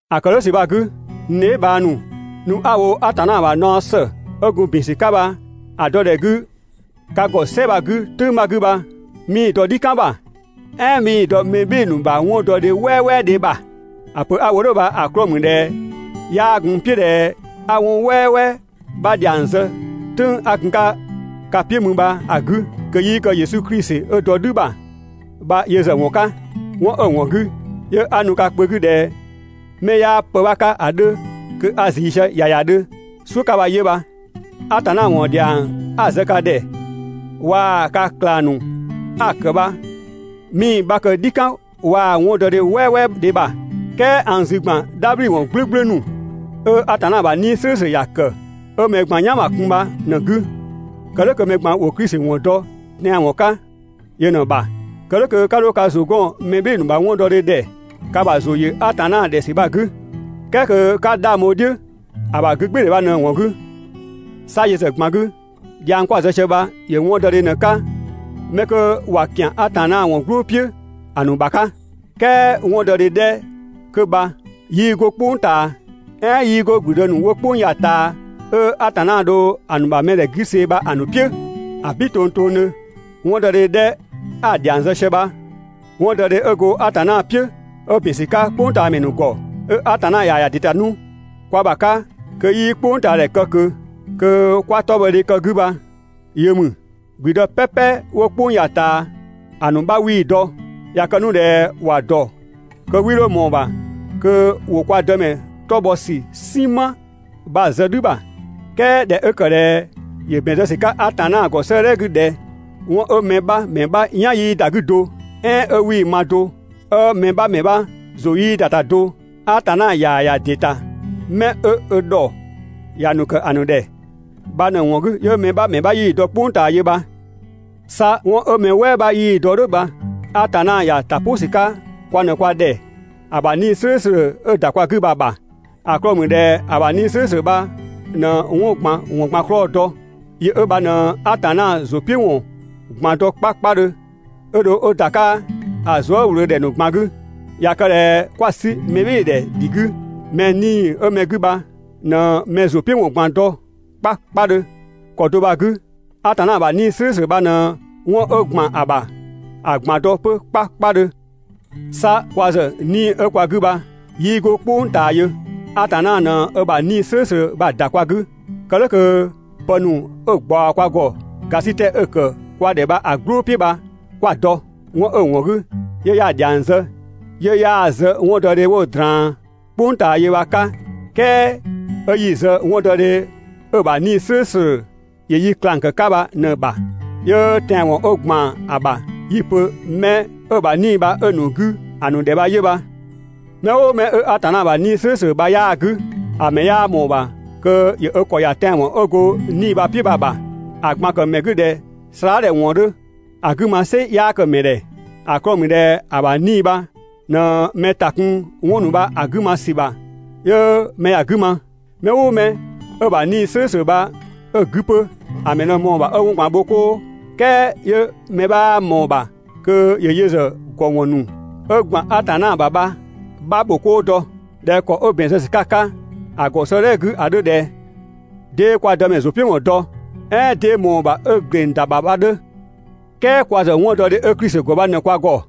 ‑A ‑kë "dhʋ̈ ‑sü bha‑ 'gü, n dheebhang ‑nu, nu 'a‑ wo Atanna ‑bha naɔ ‑së 'ö gun ‑bin ‑sü 'ka bha‑ dɔdhɛ 'gü ka ‑gɔ "sɛ bha‑ 'gü "tʋ̈ng 'bha 'gü bha, 'mii‑ dɔ "dhikan ‑bha, "ɛɛn 'mii‑ dɔ mɛ "bhɩɩ‑ ‑nu ‑bha 'wɔndɔdhe "wɛɛwɛɛdhe ‑bha. ‑A pö 'a‑ wo "dhʋ̈ bha‑ 'klɔɔ‑ ‑mü ꞊dhɛ 'yaa gun n "piʋ̈ ꞊dhɛ 'a 'wɔn "wɛɛwɛɛ 'bha ‑dhiang zë "tʋ̈ng 'a gun‑ 'ka ka "piʋ̈ mü bha‑ 'gü kö 'yii kë Yesu Klisi 'ö dɔ "dhü ‑bha bha yö ‑zë ‑wɔn 'ka. 'Wɔn 'ö‑ ‑wɔn 'gü 'yö 'a nu ka kpö 'gü ꞊dhɛ 'mɛ 'yaa pë 'bha 'ka ‑a 'dhö, kö a ꞊zii sië ‑yayadhö "suʋ̈ 'ka bha 'yö bha. Atanna ‑wɔn ‑dhiang 'a‑ zë ka ‑dhɛ waa‑ ka ꞊klang ‑nu 'a‑ ‑kë bha 'mii‑ 'bha kë "dhikan waa‑ 'wɔndɔdhe "wɛɛwɛɛdhe ‑bha. "Kɛɛ a n zü ‑gban "dhabhliwɔn "gblʋ̈gblʋ̈ ‑nu 'ö Atanna ‑bha 'Nii‑ "slʋ̈ʋ̈slʋ̈ ‑ya ‑kë, 'ö mɛ ꞊gban "yan ‑bha kun bha ꞊në‑ 'gü, kë "dhʋ̈ kö mɛ ꞊gban‑ ‑wo Klisi ‑wɔn dɔ tɛanwɔn 'ka yö ꞊në‑ ‑bha. Kë "dhʋ̈ kö 'ka 'dho ‑zʋ 'gɔn mɛ "bhɩɩ‑ ‑nu ‑bha 'wɔndɔdhe ‑dhɛ ka ‑bha ‑zʋ ‑yö Atanna ‑dhɛ ‑sü bha‑ 'gü, "kɛɛ kö 'ka 'dhang bho‑ "dhiʋ̈ ‑a ‑bha 'gügbɩɩdhɛ bha ꞊në‑ ‑wɔn 'gü. 'Sa yö ‑zë ꞊gban 'gü, dhiang 'kwa‑ zë sië bha ‑yö 'wɔndɔdhe ꞊në‑ 'ka 'mɛ 'kö ꞊wa ‑kian Atanna ‑wɔn "gblʋʋ "piʋ̈ ‑a ‑nu ‑bha 'ka. "Kɛɛ 'wɔndɔdhe 'dhɛ 'kö bha 'yii 'go "kpʋng ꞊taa, "ɛɛn 'yii 'go ‑gblüdë ‑nu 'wo "kpʋng ya‑ ꞊taa, 'ö Atanna dho‑ ‑nu ‑bha mɛdhɛ 'gü see‑ bha‑ ‑nu "piʋ̈. ‑Abin tongtongdhö! 'Wɔndɔdhe 'dhɛ 'a‑ ‑dhiang zë sië bha, 'wɔndɔdhe 'ö go Atanna "piʋ̈ 'ö ‑bin ‑sü 'ka "kpʋngtaamɛ ‑nu ‑gɔ, 'ö Atanna ꞊yaa‑ ‑ya ‑dɩ ‑ta 'nu kwa ‑bha 'ka kö 'yii "kpʋngtaadhɛ kë ꞊kö, kö 'kwa 'tɔbhɔdhe kë‑ 'gü bha yö ‑mü. ‑Gblüdë "pɛpɛ 'wo "kpʋng ya‑ ꞊taa ‑a ‑nu 'bha 'wii‑ dɔ. ꞊Ya kë 'nu ꞊dhɛ ‑wa ‑dɔ kö 'wii 'dho ꞊mɔɔ‑ ‑bha kö ‑wo kwa Dëmɛ 'tɔ bhɔ ‑sü "sinma bha‑ zë "dhü ‑bha. "Kɛɛ ꞊dhɛ 'ö ‑kë ꞊dhɛ ‑yö ‑bɛn zë ‑sü 'ka Atanna ‑gɔ 'sëëdhɛ 'gü ꞊dhɛ: «'Wɔn 'ö mɛ 'bha ‑mɛ 'bha "yan 'yii ‑da 'gü do, "ɛɛn 'ö 'wii‑ ma do, 'ö mɛ 'bha ‑mɛ 'bha ‑zʋ 'yii ‑da ‑ta do, Atanna ꞊yaa‑ ‑ya ‑dɩ ‑ta 'mɛ 'ö ö ‑dhɔ ‑ya ‑nu ‑kë ‑a ‑nu ‑dhɛ» bha ꞊në‑ ‑wɔn 'gü 'yö mɛ 'bha ‑mɛ 'bha 'yii‑ dɔ "kpʋng ꞊taa yö bha. 'Sa 'wɔn 'ö mɛ "wɛɛ 'bha 'yii‑ dɔ "dhʋ̈ bha Atanna ‑ya ‑ta "pʋ ‑sü 'ka kwa ꞊në kwa ‑dhɛ ‑a ‑bha 'Nii‑ "slʋ̈ʋ̈slʋ̈ 'ö‑ ‑da kwa 'gü bha‑ ‑bha. ‑A 'klɔɔ‑ ‑mü ꞊dhɛ ‑a ‑bha 'Nii‑ "slʋ̈ʋ̈slʋ̈ bha ꞊në 'wɔn ꞊gban ‑wɔn ꞊gban 'klɔɔ‑ dɔ, yö 'ö bha ꞊në Atanna ‑zʋ "piʋ̈ ‑wɔn ꞊gban dɔ 'kpakpadhö 'ö dho 'ö ‑da 'ka ‑a zuëwlöödhɛ ‑nu ꞊gban 'gü. ꞊Ya kë ꞊dhɛ 'kwa‑ 'sü mɛbhɩɩdhɛ ‑dhi 'gü, mɛ 'nii‑ 'ö mɛ 'gü bha ꞊në mɛ ‑zʋ "piʋ̈ ‑wɔn ꞊gban dɔ 'kpakpadhö. ‑Kɔ do bha‑ 'gü, Atanna ‑bha 'Nii‑ "slʋ̈ʋ̈slʋ̈ bha ꞊në 'wɔn 'ö ‑gban ‑a ‑bha ‑a ꞊gban dɔ 'pö 'kpakpadhö. 'Sa kwa ‑zë 'Nii‑ 'ö kwa 'gü bha 'yii 'go "kpʋng ꞊taa yö. Atanna ꞊në ö ‑bha 'Nii‑ "slʋ̈ʋ̈slʋ̈ bha ‑da kwa 'gü, kë "dhʋ̈ kö pë ‑nu 'ö‑ ꞊gbaɔ kwa ‑gɔ ‑gasitɛ 'ö‑ ‑kë kwa ‑dhɛ bha‑ "gblʋʋ "piʋ̈ bha 'kwa‑ dɔ. 'Wɔn 'ö‑ ‑wɔn 'gü 'yö 'ya‑ ‑dhiang zë 'yö 'yaa‑ zë 'wɔndɔdhe 'wo‑ ꞊draan "kpʋng ꞊taa yö bha‑ 'ka, "kɛɛ 'ö 'yi‑ zë 'wɔndɔdhe 'ö‑ ‑bha 'Nii‑ "slʋ̈ʋ̈slʋ̈ ‑yö yi ꞊klang ‑kë 'ka bha ꞊në‑ ‑bha, 'yö tɛanwɔn 'ö ‑gban ‑a ‑bha 'yi‑ pö 'mɛ 'ö‑ ‑bha 'Nii‑ bha 'ö‑ ‑nu 'gü ‑a ‑nu ‑dhɛ bha 'yö bha. Mɛ "ʋʋ mɛ 'ö Atanna ‑bha 'Nii‑ "slʋ̈ʋ̈slʋ̈ bha 'yaa‑ 'gü, ‑a ‑mɛ 'yaa ꞊mɔɔ‑ ‑bha kö ‑yö ö ‑kɔ ‑ya tɛanwɔn 'ö go 'Nii‑ bha‑ "piʋ̈ bha‑ ‑bha. ‑A ꞊gban‑ ‑kë ‑mɛ 'gü ꞊dhɛ slaadhɛ ‑wɔn 'dhö. ‑A 'gü ma "sɩ 'yaa kë‑ ‑mɛ ‑dhɛ. ‑A 'klɔɔ‑ ‑mü ꞊dhɛ ‑a ‑bha 'Nii‑ bha ꞊në mɛ ‑ta kun 'wɔn ‑nu bha‑ ‑nu 'gü ma ‑sü ‑bha 'yö mɛ ‑ya 'gü ma. Mɛ "ʋʋ mɛ 'ö‑ ‑bha 'Nii‑ "slʋ̈ʋ̈slʋ̈ bha 'ö‑ 'gü 'pö, ‑a ‑mɛ ꞊në ꞊mɔɔ‑ ‑bha 'ö 'wɔn ꞊gban bho 'koo, "kɛɛ 'yö mɛ 'bhaa ꞊mɔɔ‑ ‑bha kö ‑yö yö ‑zë ‑gɔwɔn ‑nu 'ö ‑gban Atanna ‑bha bha‑ 'bha ‑bho 'koo dɔ. ꞊Dhɛ ‑kɔ 'ö ‑bɛn zë ‑sü 'ka‑ 'ka ‑a ‑gɔ 'sëëdhɛ 'gü ‑a 'dhö ꞊dhɛ: «'Dee kwa Dëmɛ ‑zʋ "piʋ̈ ‑wɔn dɔ? "ɛɛn 'dee ꞊mɔɔ‑ ‑bha 'ö ‑gleng ‑da ‑bha?» bha‑ 'dhö. "Kɛɛ kwa ‑zë 'wɔndɔdhe 'ö Klisi ‑gɔ bha ꞊në kwa ‑gɔ.